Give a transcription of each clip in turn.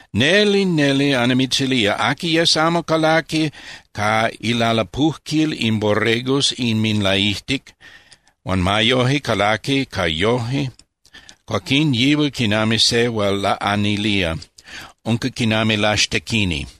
Neli, neli annimitzilía, aqui yes amo calaqui ca ilalapujquil in borregos inminlaijtic, huan ma yoje calaqui ca yoje, cuaquín yihual quinami se hual laꞌanilía, unca quinami laxtequini.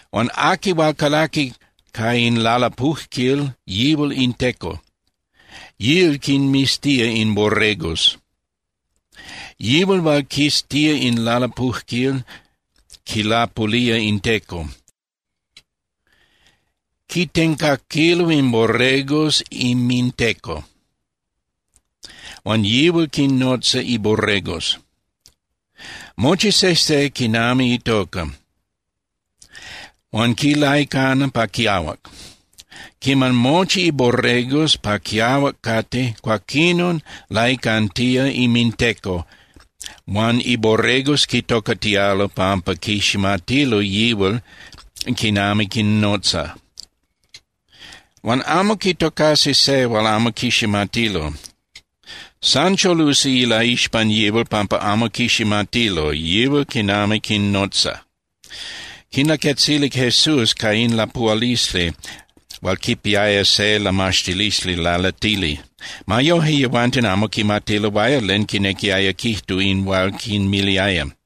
Huan aqui hual calaqui ca in lalapujquil, yihual in teco, yíal quinmiztía in borregos. Yihual hual quiztía in lalapujquil quilapulía in teco. Quitencaquilo in borregos inminteco huan yihual quinnotza iborregos, mochi sejse quinami itoca, huan quinlaicana pa quiahuac. Quiman mochi iborregos pa quiahuac cate, cuaquinon laicantía inminteco huan iborregos quitocatialo pampa quiximatilo yihual quinami quinnotza. Huan amo quitocasi se hual amo quiximatilo. San cholusi ilaixpan yihual pampa amo quiximatilo yihual quinami quinnotza. Quinlaquetzilic Jesús ca in lapuhualisli hual quipiaya se lamaxtilisli lalatili. Ma yoje, yehuanten amo quimatiloaya len quinequiaya quijtu in hual quinmiliaya.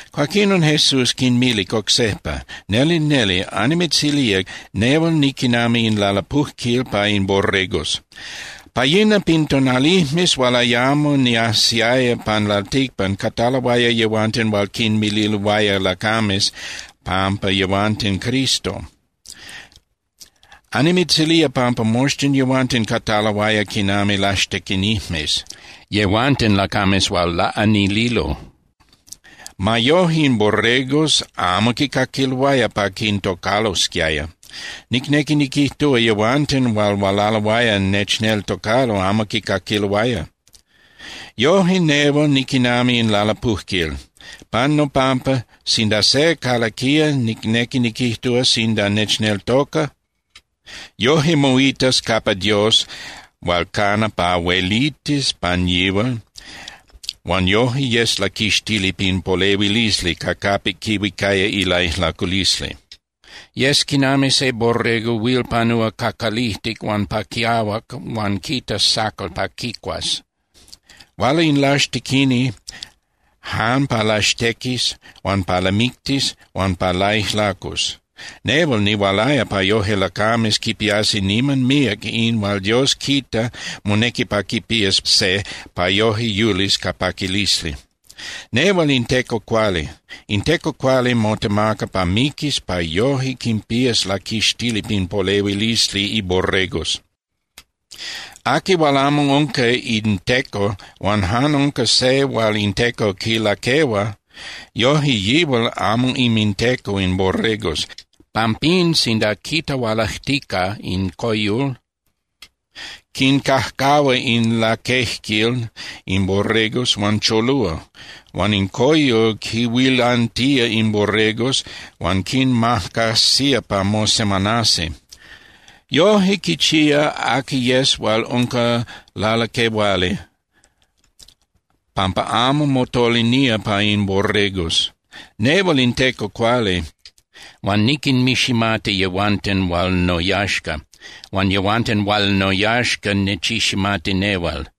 Cuaquinon, Jesús quinmilic oc sejpa: —Neli, neli annimitzilía nehual niquinami in lalapujquil pa in borregos. Pa yina pin tonalijmes hual ayamo niajsiaya pan lalticpan cataloaya yehuanten hual quinmililoaya lacames pampa yehuanten Cristo. Annimitzilía pampa moxtin yehuanten cataloaya quinami laxtequinijmes, yehuanten lacames hual laꞌanililo. Ma yoje, in borregos amo quicaquiloaya pa quintocalosquiaya. Nicnequi niquijtúa, yehuanten hual hualaloaya nechneltocalo amo quicaquiloaya. Yoje, nehual niquinami in lalapujquil. Pan nopampa, sinda se calaquía, nicnequi niquijtúa, sinda nechneltoca, yoje moitas capa Dios hual cana pa huelitis pan yihual huan yoje yes laquixtili pin polehuilisli ca capic quihuicaya ilaijlaculisli. Yes quinami se borrego huil panúa ca calijtic huan pa quiahuac huan quitas sacal pa quicuas. Huala in laxtequini jan pa laxtequis huan pa lamictis huan pa laijlacus. Nehual nihualaya pa yoje lacames quipiasi niman míac in hual Dios quita monequi pa quipías se pa yoje yulis ca paquilisli. Nehual in teco cuali. In teco cuali motemaca pa miquis pa yoje quinpías laquixtili pin polehuilisli iborregos. Aqui hual amo unca in teco huan jan unca se hual in teco quilaquehua, yoje yihual amo inminteco in borregos. Pampín, sinda quita hualajtica in coyol, quincajcahua in laquejquil in borregos huan cholúa. Huan in coyol quinhuilantía in borregos huan quinmacajsía pa mosemanasi. Yoje quichía aqui yes hual unca lalaquehuali, pampa amo motolinía pa in borregos. Nehual in teco cuali, huan niquinmiximati yehuanten hual noyaxca. Huan yehuanten hual noyaxca nechiximati nehual.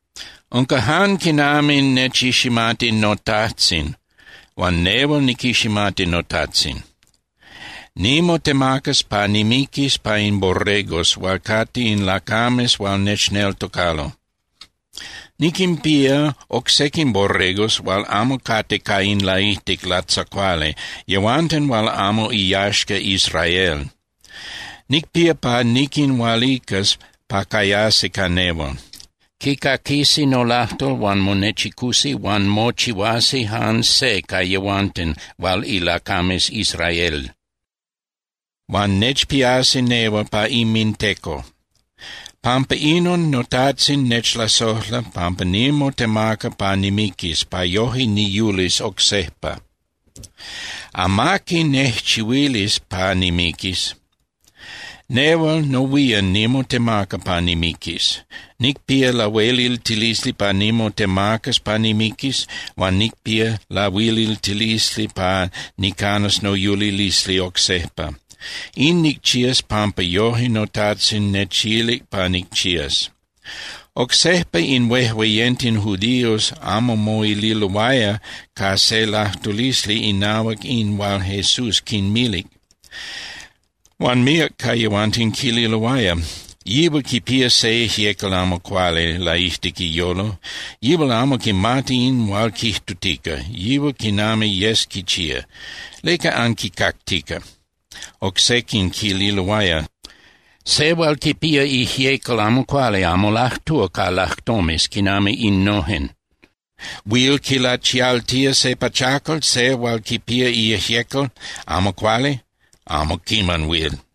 Unca jan quinami nechiximati noTajtzin huan nehual niquiximati noTajtzin. Nimotemacas pa nimiquis pa in borregos hual cate in lacames hual nechneltocalo. Niquinpía oc sequin borregos hual amo cate ca in laijtic latzacuali, yehuanten hual amo iyaxca Israel. Nicpía pa niquinhualicas pa cayasi ca nehual. Quicaquisi nolajtol huan monechicusi huan mochihuasi jan se ca yehuanten hual ilacames Israel, huan nechpiasi nehual pa inminteco. Pampa inon noTajtzin nechlasojla pampa nimotemaca pa nimiquis, pa yoje niyulis oc sejpa. Amaqui nejchihuilis pa nimiquis. Nehual nohuían nimotemaca pa nimiquis. Nicpía lahueliltilisli pa nimotemacas pa nimiquis, huan nicpía lahueliltilisli pa nicanas noyulilisli oc sejpa. In nicchías pampa yoje noTajtzin nechilic pa nicchías. Oc sejpa in huejueyenten judíos amo moililoaya ca se lajtulisli inahuac in hual Jesús quinmilic. Huan míac ca yehuanten quililoaya: —Yihual quipía se ijyecal amo cuali laijtic iyolo. Yihual amo quimati in hual quijtutica, yihual quinami yes quichía. ¿Leca anquicactica? Oc sequin quililoaya: —Se hual quipía ijyecal amo cuali amo lajtúa ca lajtomes quinami innojen. ¿Huil quilachialtía se pachacal se hual quipía ijyecal amo cuali? ¡Amo quiman huil!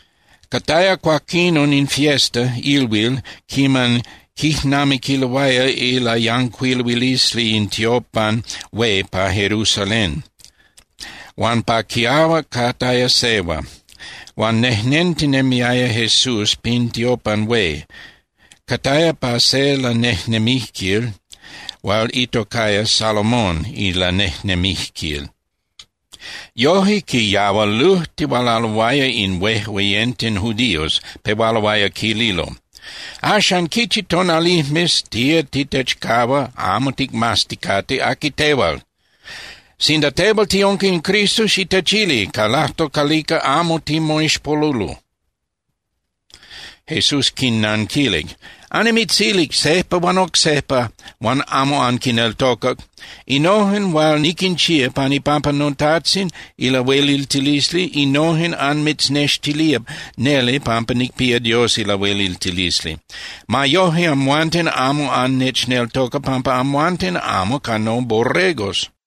Cataya cuaquinon in fiesta (ilhuil) quiman quijnamiquiloaya ilayancuiluilisli in tiopan hué pa Jerusalén, huan pa quiahuac cataya sehua. Huan nejnentinemiaya Jesús pin tiopan hué, cataya pa se lanejnemijquil hual itocaya Salomón ilanejnemijquil. Yoje, quiyahualujtihualaloaya in huejueyenten judíos, pehualoaya quililo: —Axan, ¿quichi tonalijmes tía titechcahua amo ticmazticate aqui tehual? Sinda tehual tiunca in Cristo, xitechili ca lajtol calica amo timoixpolulo. Jesús quinnanquilic: —Annimitzilic sejpa huan oc sejpa huan amo anquineltocac. Innojen hual niquinchía pan ipampa noTajtzin ilahueliltilisli, innojen anmitznextilía neli pampa nicpía Dios ilahueliltilisli. Ma yoje, amhuanten amo annechneltoca pampa amhuanten amo ca noborregos.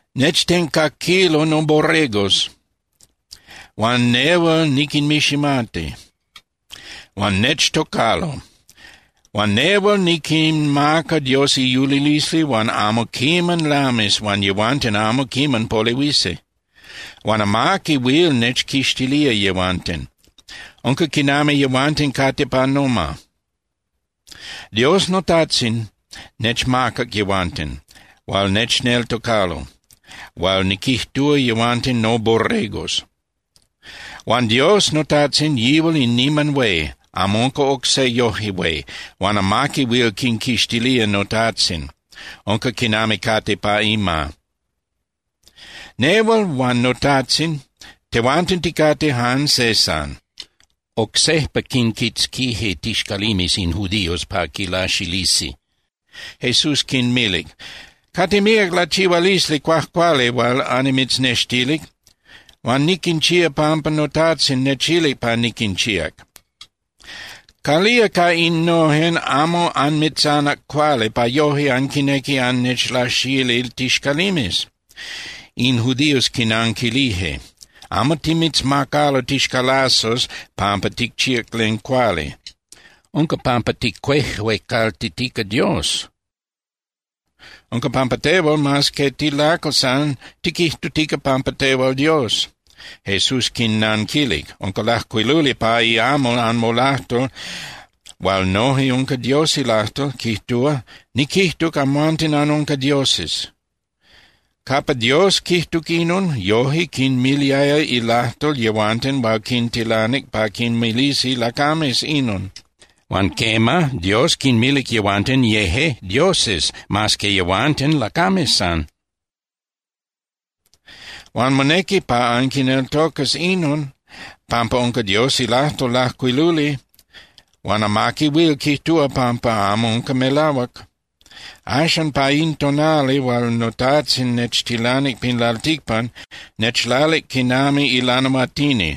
Nechtencaquilo noborregos, huan nehual niquinmiximati, huan nechtocalo. Huan nehual niquinmaca Dios iyulilisli hual amo quiman lamis huan yehuanten amo quiman polehuisi. Huan amaqui huil nechquixtilía yehuanten. Unca quinami yehuanten cate pa noma. Dios noTajtzin nechmacac yehuanten hual nechneltocalo hual niquijtúa yehuanten noborregos. Huan Dios noTajtzin, yihual in niman hué, amo unca oc se yoje hué. Huan amaqui huil quinquixtilía noTajtzin, unca quinami cate pa ima. Nehual huan noTajtzin, tehuanten ticate jan se san. Oc sejpa quinquitzquije tixcalimes in judíos pa quilaxilisi. Jesús quinmilic: —Cate míac lachihualisli cuajcuali hual annimitznextilic. Huan niquinchíac pampa noTajtzin nechilic pa niquinchíac. ¿Calía ca innojen amo anmitzanac cuali pa yoje anquinequi annechlaxili tixcalimes? In judíos quinanquilije: —Amo timitzmacalo tixcalazos pampa ticchíac len cuali. Unca pampa ticuejuecaltitica Dios. Unca pampa tehual, mas que tilacal san, tiquijtutica pampa tehual Dios. Jesús quinnanquilic: —Unca lajcuiluli pa iamal anmolajtol hual noje unca Dios ilajtol, quijtúa: “Niquijtuc: Amhuanten anunca dioses.” Capa Dios quijtuc inon, yoje quinmiliaya ilajtol yehuanten hual quintilanic pa quinmilisi lacames inon. Huan quema, Dios quinmilic yehuanten yeje dioses mas que yehuanten lacames san. Huan monequi pa anquineltocas inon, pampa unca Dios ilajtol lajcuiluli huan amaqui huil quijtúa pampa amo unca melahuac. Axan, pa in tonali hual noTajtzin nechtilanic pin lalticpan, nechlalic quinami ilanahuatini.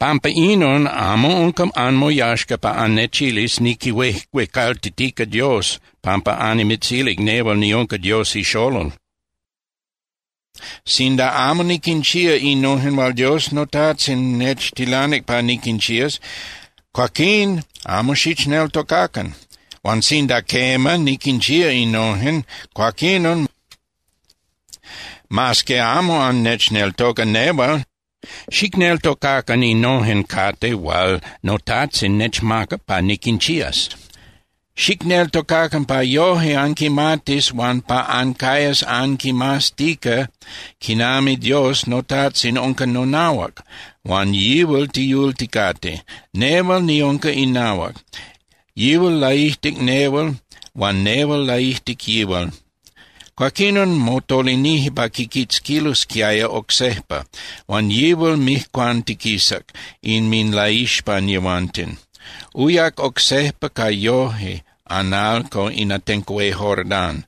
Pampa inon amo unca anmoyaxca pa annechilis niquihuejuecaltitica Dios pampa annimitzilic nehual niunca Dios iXolol. Sinda amo niquinchía innojen hual Dios noTajtzin nechtilanic pa niquinchías, cuaquín amo xichneltocacan. Huan sinda quema niquinchía innojen, cuaquinon, mas que amo annechneltoca nehual, xicneltocacan innojen cate hual noTajtzin nechmacac pa niquinchías. Xicneltocacan pa yoje anquimatis huan pa ancayas anquimaztica quinami Dios noTajtzin unca nonahuac, huan yihual tiyulticate, nehual niunca inahuac. Yihual laijtic nehual huan nehual laijtic yihual. Cuaquinon motolinije pa quiquitzquilosquiaya oc sejpa, huan yihual mijcuantiquisac inminlaixpan yehuanten. Uyac oc sejpa ca yoje (analco) in atenco hué Jordán,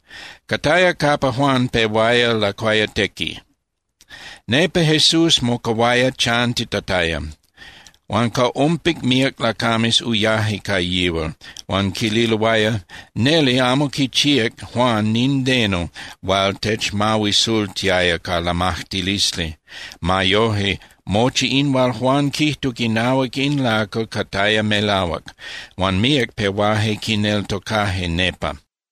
cataya capa Juan pehuaya lacuayatequi. Nepa Jesús mocahuaya chantitataya. Huan ca ompic míac lacames uyaje ca yihual, huan quililoaya: —Neli amo quichíac Juan nindeno hual techmahuisultiaya ca lamajtilisli. Ma yoje, mochi in hual Juan quijtuc inahuac in lacal cataya melahuac. Huan míac pehuaje quineltocaje nepa.